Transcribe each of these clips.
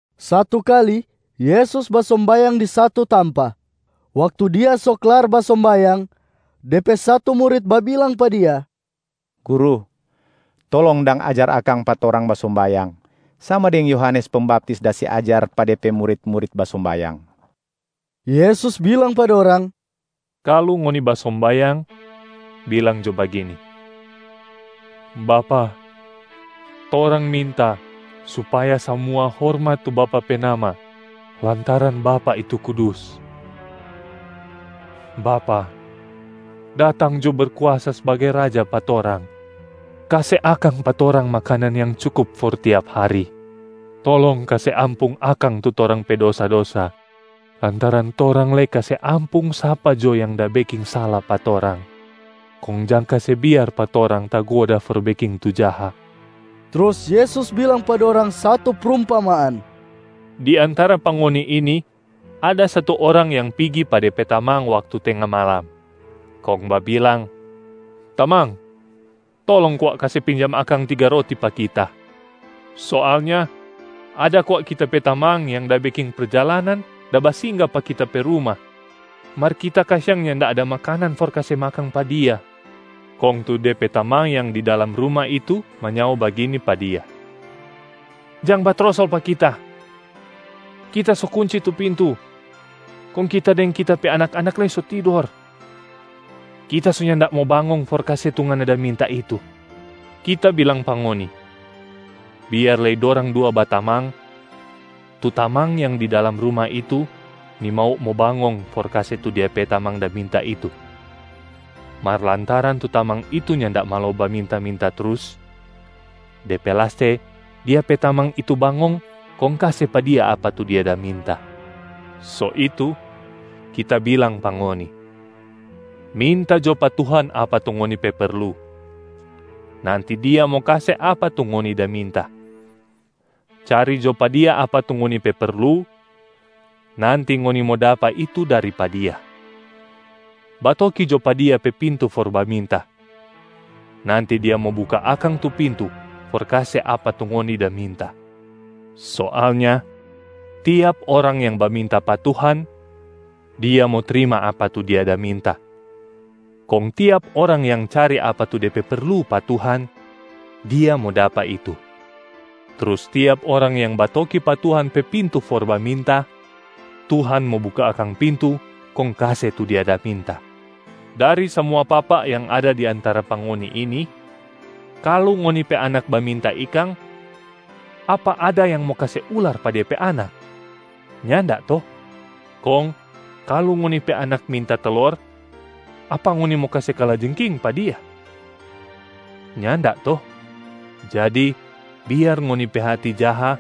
Satu kali Yesus basombayang di satu tampa. Waktu Dia so klar basombayang, De pe satu murit babilang pa Dia, “Guru, tolong dang ajar akang pa torang basombayang, sama deng Yohanes Pembaptis da se ajar pa de pe murit-murit basombayang.” Yesus bilang pa dorang, “Kalu ngoni basombayang, bilang jo bagini, ‘Bapa, torang minta supaya samua hormat tu Bapa pe nama lantaran Bapa itu kudus. Bapa, datang jo Berkuasa sbagai Raja pa torang. Kase akang pa torang makanan yang cukup for tiap hari. Tolong kase ampung akang tu torang pe dosa-dosa lantaran torang lei kase ampung sapa jo yang da beking sala pa torang, kong jang kase biar pa torang tagoda for beking tu jaha.’” Trus Yesus bilang pa dorang satu prumpamaan, “Di antara pa ngoni ini ada satu orang yang pigi pa de pe tamang waktu tenga malam, kong babilang, ‘Tamang, tolong kwa kase pinjam akang tiga roti pa kita. Soalnya ada kwa kita pe tamang yang da beking perjalanan da basingga pa kita pe ruma, mar kita kasiang nyanda ada makanan for kase makang pa dia.’ Kong tu de pe tamang yang di dalam ruma itu manyao bagini pa dia, ‘Jang batrosol pa kita! Kita so kunci tu pintu, kong kita deng kita pe anak-anak lei so tidor. Kita so nyanda mo bangong for kase tu ngana da minta itu.’ Kita bilang pa ngoni, biar lei dorang dua batamang, tu tamang yang di dalam ruma itu nimau mo bangong for kase tu dia pe tamang da minta itu. Mar lantaran tu tamang itu nyanda malo baminta-minta trus, de pe laste dia pe tamang itu bangong kong kase pa dia apa tu dia da minta. So itu, Kita bilang pa ngoni, minta jo pa Tuhan apa tu ngoni pe perlu, nanti Dia mo kase apa tu ngoni da minta. Cari jo pa Dia apa tu ngoni pe perlu, nanti ngoni mo dapa itu dari pa Dia. Batoki jo pa Dia pe pintu for baminta, nanti Dia mo buka akang tu pintu for kase apa tu ngoni da minta. Soalnya tiap orang yang baminta pa Tuhan, dia mo trima apa tu dia da minta. Kong tiap orang yang cari apa tu de pe perlu pa Tuhan, dia mo dapa itu. Trus tiap orang yang batoki pa Tuhan pe pintu for baminta, Tuhan mo buka akang pintu kong kase tu dia da minta. Dari samua papa yang ada di antara pa ngoni ini, kalu ngoni pe anak baminta ikang, apa ada yang mo kase ular pa dia pe anak? Nyanda to? Kong kalu ngoni pe anak minta telor, apa ngoni mo kase kalajengking pa dia? Nyanda to? Jadi biar ngoni pe hati jaha,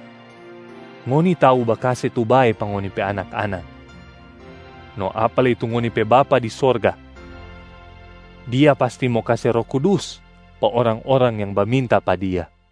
ngoni tau bakase tu bae pa ngoni pe anak-anak. No apa lei tu ngoni pe Bapa di sorga! Dia pasti mo kase Roh Kudus pa orang-orang yang baminta pa Dia.”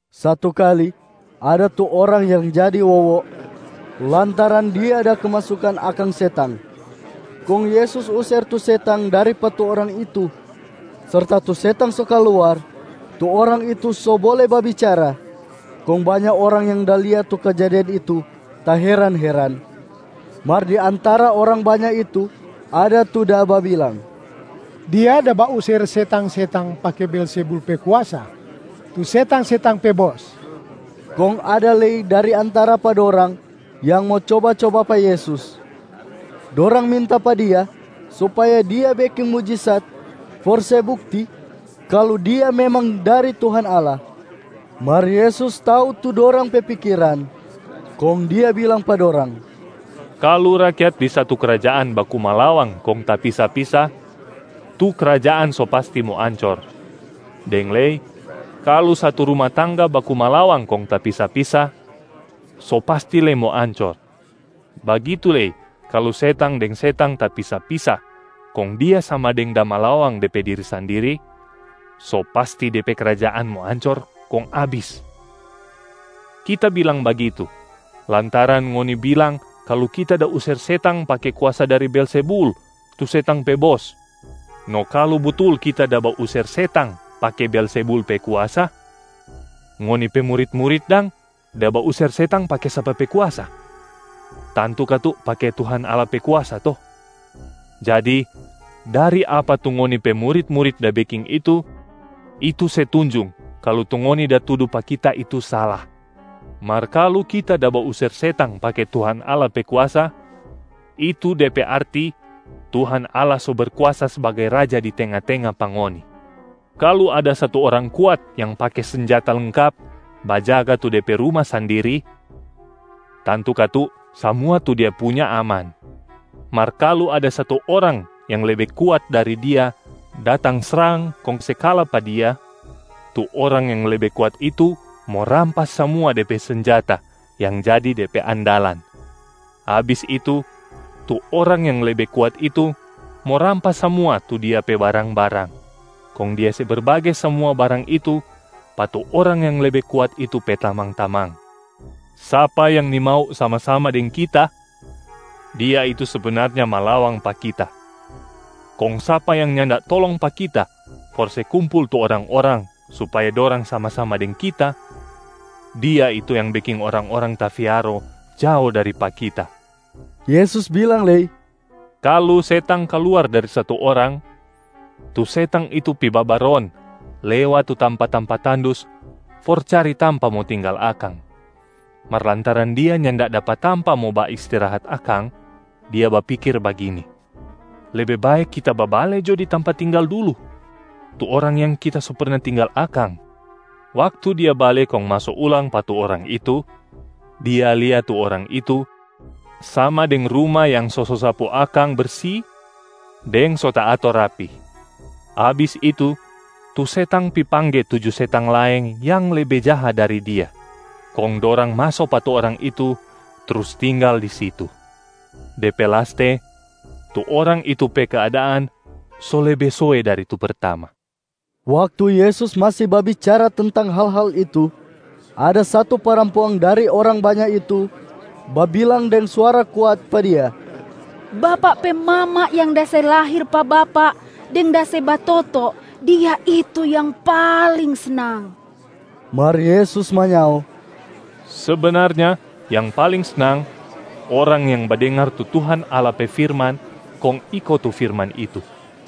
Satu kali, ada tu orang yang jadi wowo lantaran dia da kemasukan akang setang, kong Yesus user tu setang dari pa tu orang itu. Serta tu setang so kaluar, tu orang itu so bole babicara, kong banya orang yang da lia tu kejadian itu taheran-heran. Mar di antara orang banya itu ada tu da babilang, “Dia da bauser setang-setang pake Beelzebul pe kuasa, tu setang-setang pe bos.” Kong ada lei dari antara pa dorang yang mo coba-coba pa Yesus. Dorang minta pa Dia supaya Dia beking mujisat for se bukti kalu Dia memang dari Tuhan Allah. Mar Yesus tau tu dorang pe pikiran, kong Dia bilang pa dorang, “Kalu rakyat di satu krajaan baku malawang kong tapisa-pisa, tu krajaan so pasti mo ancor, deng lei kalu satu ruma tangga baku malawang kong tapisa-pisa, so pasti lei mo ancor. Bagitu lei kalu setang deng setang tapisa-pisa kong dia sama deng da malawang de pe diri sandiri, so pasti de pe krajaan mo ancor kong abis. Kita bilang bagitu lantaran ngoni bilang kalu Kita da user setang pake kuasa dari Beelzebul tu setang pe bos. No kalu butul Kita da bauser setang pake Beelzebul pe kuasa, ngoni pe murit-murit dang da bauser setang pake sapa pe kuasa? Tantu katu pake Tuhan Allah pe kuasa to? Jadi dari apa tu ngoni pe murit-murit da beking itu, itu se tunjung kalu tu ngoni da tudu pa kita itu sala. Mar kalu Kita da bauser setang pake Tuhan Allah pe kuasa, itu de pe arti Tuhan Allah so Berkuasa sbagai Raja di tenga-tenga pa ngoni. Kalu ada satu orang kuat yang pake senjata lengkap bajaga tu de pe ruma sandiri, tantu katu samua tu dia punya aman. Mar kalu ada satu orang yang lebe kuat dari dia datang srang kong se kala pa dia, tu orang yang lebe kuat itu mo rampas samua de pe senjata yang jadi de pe andalan. Abis itu, tu orang yang lebe kuat itu mo rampas samua tu dia pe barang-barang, kong dia se berbage samua barang itu pa tu orang yang lebe kuat itu pe tamang-tamang. Sapa yang nimau sama-sama deng Kita, dia itu sebenarnya malawang pa Kita. Kong sapa yang nyanda tolong pa Kita for se kumpul tu orang-orang supaya dorang sama-sama deng Kita, dia itu yang beking orang-orang tafiaro jao dari pa Kita.” Yesus bilang lei, “Kalu setang kaluar dari satu orang, tu setang itu pi babaron lewat tu tampa-tampa tandus for cari tampa mo tinggal akang. Mar lantaran dia nyanda dapa tampa mo baistirahat akang, dia bapikir bagini, ‘Lebe bae kita babale jo di tampa tinggal dulu, tu orang yang kita so perna tinggal akang.’ Waktu dia bale kong maso ulang pa tu orang itu, dia lia tu orang itu sama deng ruma yang so sosapu akang bersi deng so taator rapi. Abis itu, tu setang pi pangge tuju setang laeng yang lebe jaha dari dia, kong dorang maso pa tu orang itu trus tinggal di situ. De pe laste, tu orang itu pe keadaan so lebe soe dari tu pertama.” Waktu Yesus masi babicara tentang hal-hal itu, ada satu parampuang dari orang banya itu babilang deng suara kuat pa Dia, “Bapak pe mama yang da se lahir pa Bapak deng da se batoto, dia itu yang paling snang.” Mar Yesus manyao, “Sebenarnya yang paling snang, orang yang badengar tu Tuhan Allah pe firman kong iko tu firman itu.”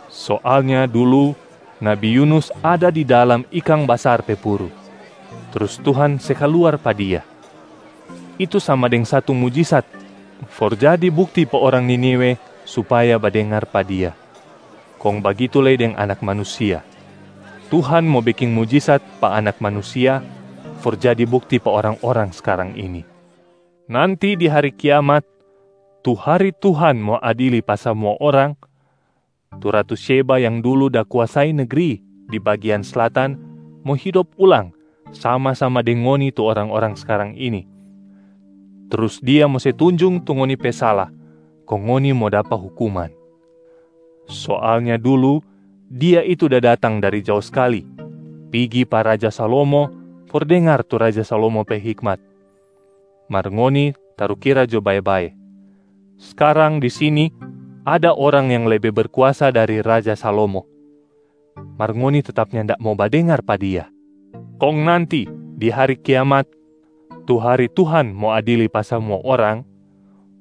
Soalnya dulu nabi Yunus ada di dalam ikang basar pe puru trus Tuhan se kaluar pa dia, itu sama deng satu mujisat for jadi bukti pa orang Niniwe supaya badengar pa dia. Kong bagitu lei deng Anak Manusia, Tuhan mo beking mujisat pa Anak Manusia for jadi bukti pa orang-orang skarang ini. Nanti di hari kiamat, tu hari Tuhan mo adili pa samua orang, tu ratu Syeba yang dulu da kuasai negri di bagian Slatan mo hidop ulang sama-sama deng ngoni tu orang-orang skarang ini. Trus dia mo se tunjung tu ngoni pe sala kong ngoni mo dapa hukuman. Soalnya dulu dia itu da datang dari jao skali pigi pa raja Salomo for dengar tu raja Salomo pe hikmat. Mar ngoni tarukira jo bae-bae, skarang di sini ada Orang yang lebe berkuasa dari raja Salomo, mar ngoni tetap nyanda mo badengar pa Dia. Kong nanti di hari kiamat tu hari Tuhan mo adili pa samua orang,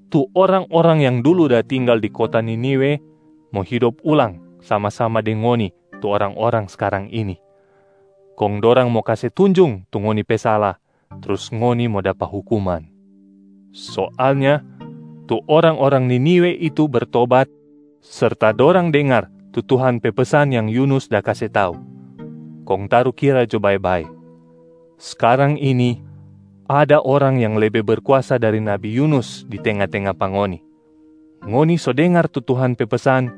tu orang-orang yang dulu da tinggal di kota Niniwe mo hidop ulang sama-sama deng ngoni tu orang-orang skarang ini, kong dorang mo kase tunjung tu ngoni pe sala trus ngoni mo dapa hukuman. Soalnya tu orang-orang Niniwe itu bertobat serta dorang dengar tu Tuhan pe pesan yang Yunus da kase tau. Kong tarukira jo bae-bae, skarang ini ada Orang yang lebe berkuasa dari nabi Yunus di tenga-tenga pa ngoni, ngoni so dengar tu Tuhan pe pesan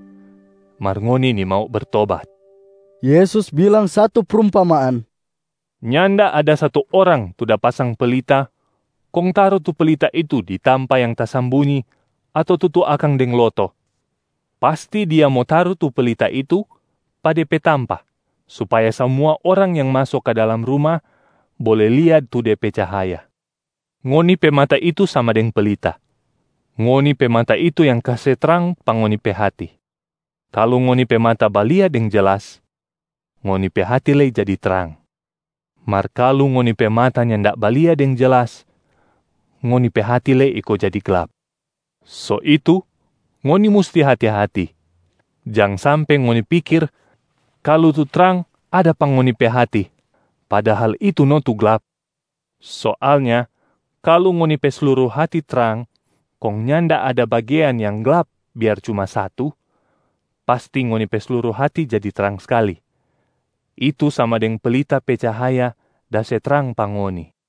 mar ngoni nimau bertobat.” Yesus bilang satu prumpamaan, “Nyanda ada satu orang tu da pasang pelita kong taru tu pelita itu di tampa yang tasambunyi ato tutu akang deng loto. Pasti dia mo taru tu pelita itu pa de pe tampa supaya samua orang yang maso ka dalam ruma bole lia tu de pe cahaya. Ngoni pe mata itu sama deng pelita. Ngoni pe mata itu yang kase trang pa ngoni pe hati. Kalu ngoni pe mata balia deng jelas, ngoni pe hati lei jadi trang. Mar kalu ngoni pe mata nyanda balia deng jelas, ngoni pe hati lei iko jadi glap. So itu ngoni musti hati-hati, jang sampe ngoni pikir kalu tu trang ada pa ngoni pe hati, padahal itu no tu glap. Soalnya kalu ngoni pe sluru hati trang kong nyanda ada bagean yang glap biar cuma satu, pasti ngoni pe sluru hati jadi trang skali, itu sama deng pelita pe cahaya da se trang pa ngoni.”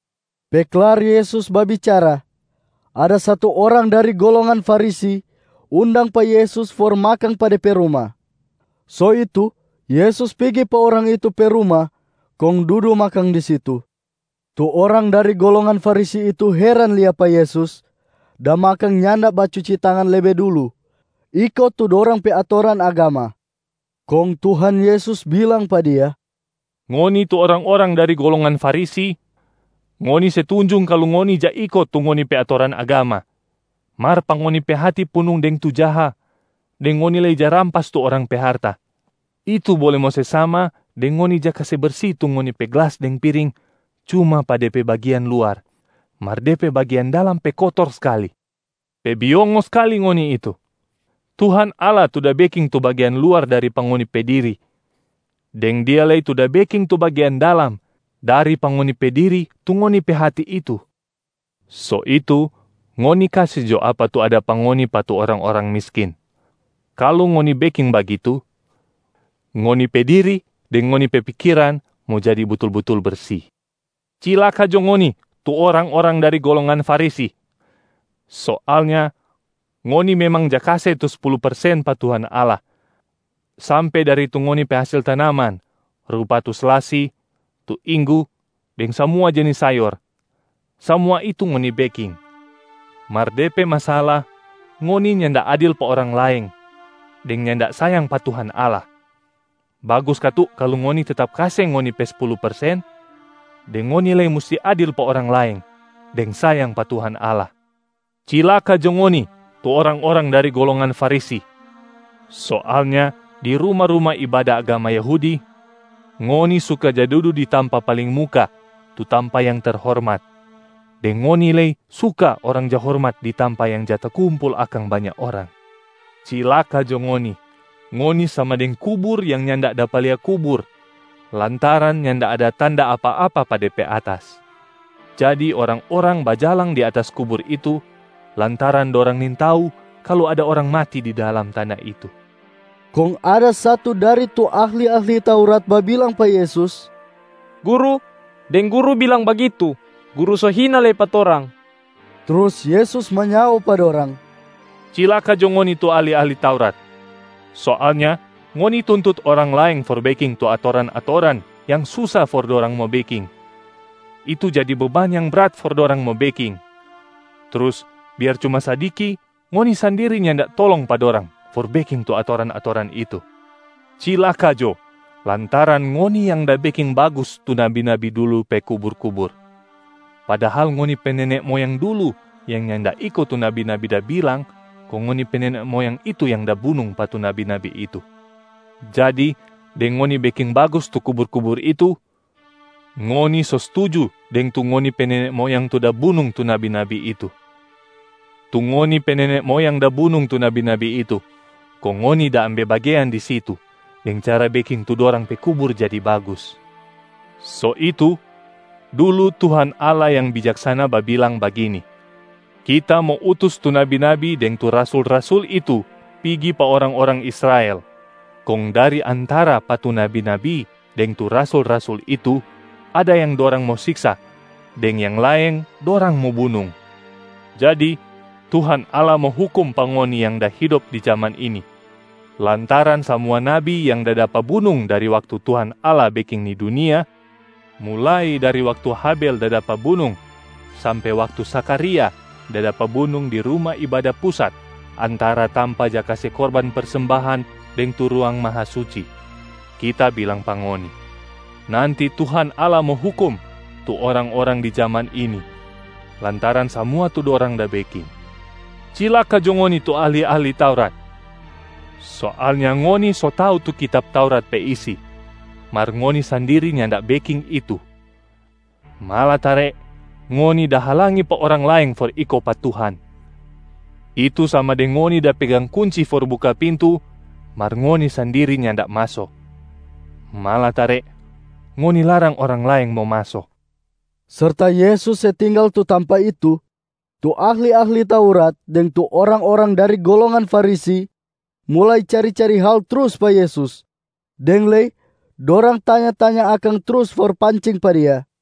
Pe klar Yesus babicara, ada satu orang dari golongan Farisi undang pa Yesus for makang pa de pe ruma. So itu Yesus pigi pa orang itu pe ruma kong dudu makang di situ. Tu orang dari golongan Farisi itu heran lia pa Yesus da makang nyanda bacuci tangan lebe dulu iko tu dorang pe atoran agama. Kong Tuhan Yesus bilang pa dia, “Ngoni tu orang-orang dari golongan Farisi, ngoni se tunjung kalu ngoni ja iko tu ngoni pe atoran agama, mar pa ngoni pe hati punung deng tu jaha deng ngoni lei ja rampas tu orang pe harta. Itu bole mo se sama deng ngoni ja kase bersi tu ngoni pe glas deng piring cuma pa de pe bagian luar, mar de pe bagian dalam pe kotor skali. Pe biongo skali ngoni itu! Tuhan Allah tu da beking tu bagean luar dari pa ngoni pe diri, deng Dia lei tu da beking tu bagean dalam dari pa ngoni pe diri tu ngoni pe hati itu. So itu ngoni kase jo apa tu ada pa ngoni pa tu orang-orang miskin. Kalu ngoni beking bagitu, ngoni pe diri deng ngoni pe pikiran mo jadi butul-butul bersi. Cilaka jo ngoni tu orang-orang dari golongan Farisi! Soalnya ngoni memang ja kase tu spulu persen pa Tuhan Allah sampe dari tu ngoni pe hasil tanaman rupa tu selasi, tu inggu deng samua jenis sayor, samua itu ngoni beking. Mar de pe masala ngoni nyanda adil pa orang laeng deng nyanda sayang pa Tuhan Allah. Bagus katu kalu ngoni tetap kase ngoni pe spulu persen, deng ngoni lei musti adil pa orang laeng deng sayang pa Tuhan Allah. Cilaka jo ngoni tu orang-orang dari golongan Farisi! Soalnya di ruma-ruma ibada agama Yahudi, ngoni suka ja dudu di tampa paling muka tu tampa yang terhormat, deng ngoni lei suka orang ja hormat di tampa yang ja takumpul akang banya orang. Cilaka jo ngoni, ngoni sama deng kubur yang nyanda dapa lia kubur lantaran nyanda ada tanda apa-apa pa de pe atas. Jadi orang-orang bajalang di atas kubur itu lantaran dorang nintau kalu ada orang mati di dalam tana itu.” Kong ada satu dari tu ahli-ahli Taurat babilang pa Yesus, “Guru, deng Guru bilang bagitu, Guru so hina lei pa torang.” Trus Yesus manyao pa dorang, “Cilaka jo ngoni tu ahli-ahli Taurat! Soalnya ngoni tuntut orang laeng for beking tu atoran-atoran yang susa for dorang mo beking, itu jadi beban yang brat for dorang mo beking. Trus, biar cuma sadiki ngoni sandiri nyanda tolong pa dorang for beking tu atoran-atoran itu. Cilaka jo, lantaran ngoni yang da beking bagus tu nabi-nabi dulu pe kubur-kubur, padahal ngoni pe nene moyang dulu yang nyanda iko tu nabi-nabi da bilang kong ngoni pe nene moyang itu yang da bunung pa tu nabi-nabi itu. Jadi deng ngoni beking bagus tu kubur-kubur itu, ngoni so stuju deng tu ngoni pe nene moyang tu da bunung tu nabi-nabi itu. Tu ngoni pe nene moyang da bunung tu nabi-nabi itu, kong ngoni da ambe bagean di situ deng cara beking tu dorang pe kubur jadi bagus. So itu, dulu Tuhan Allah yang bijaksana babilang bagini, ‘Kita mo utus tu nabi-nabi deng tu rasul-rasul itu pigi pa orang-orang Israel, kong dari antara pa tu nabi-nabi deng tu rasul-rasul itu ada yang dorang mo siksa deng yang laeng dorang mo bunung.’ Jadi Tuhan Allah mo hukum pa ngoni yang da hidop di jaman ini lantaran samua nabi yang da dapa bunung dari waktu Tuhan Allah beking ni dunia, mulai dari waktu Habel da dapa bunung sampe waktu Zakharia da dapa bunung di Ruma Ibada Pusat antara tampa ja kase korban persembahan deng tu Ruang Mahasuci. Kita bilang pa ngoni, nanti Tuhan Allah mo hukum tu orang-orang di jaman ini lantaran samua tu dorang da beking. Cilaka jo ngoni tu ahli-ahli Taurat! Soalnya ngoni so tau tu kitab Taurat pe isi mar ngoni sandiri nyanda beking itu, malatare ngoni da halangi pa orang laeng for iko pa Tuhan. Itu sama deng ngoni da pegang kunci for buka pintu mar ngoni sandiri nyanda maso, malatare ngoni larang orang laeng mo maso.” Serta Yesus se tinggal tu tampa itu, tu ahli-ahli Taurat deng tu orang-orang dari golongan Farisi mulai cari-cari hal trus pa Yesus, deng lei dorang tanya-tanya akang trus for pancing pa Dia.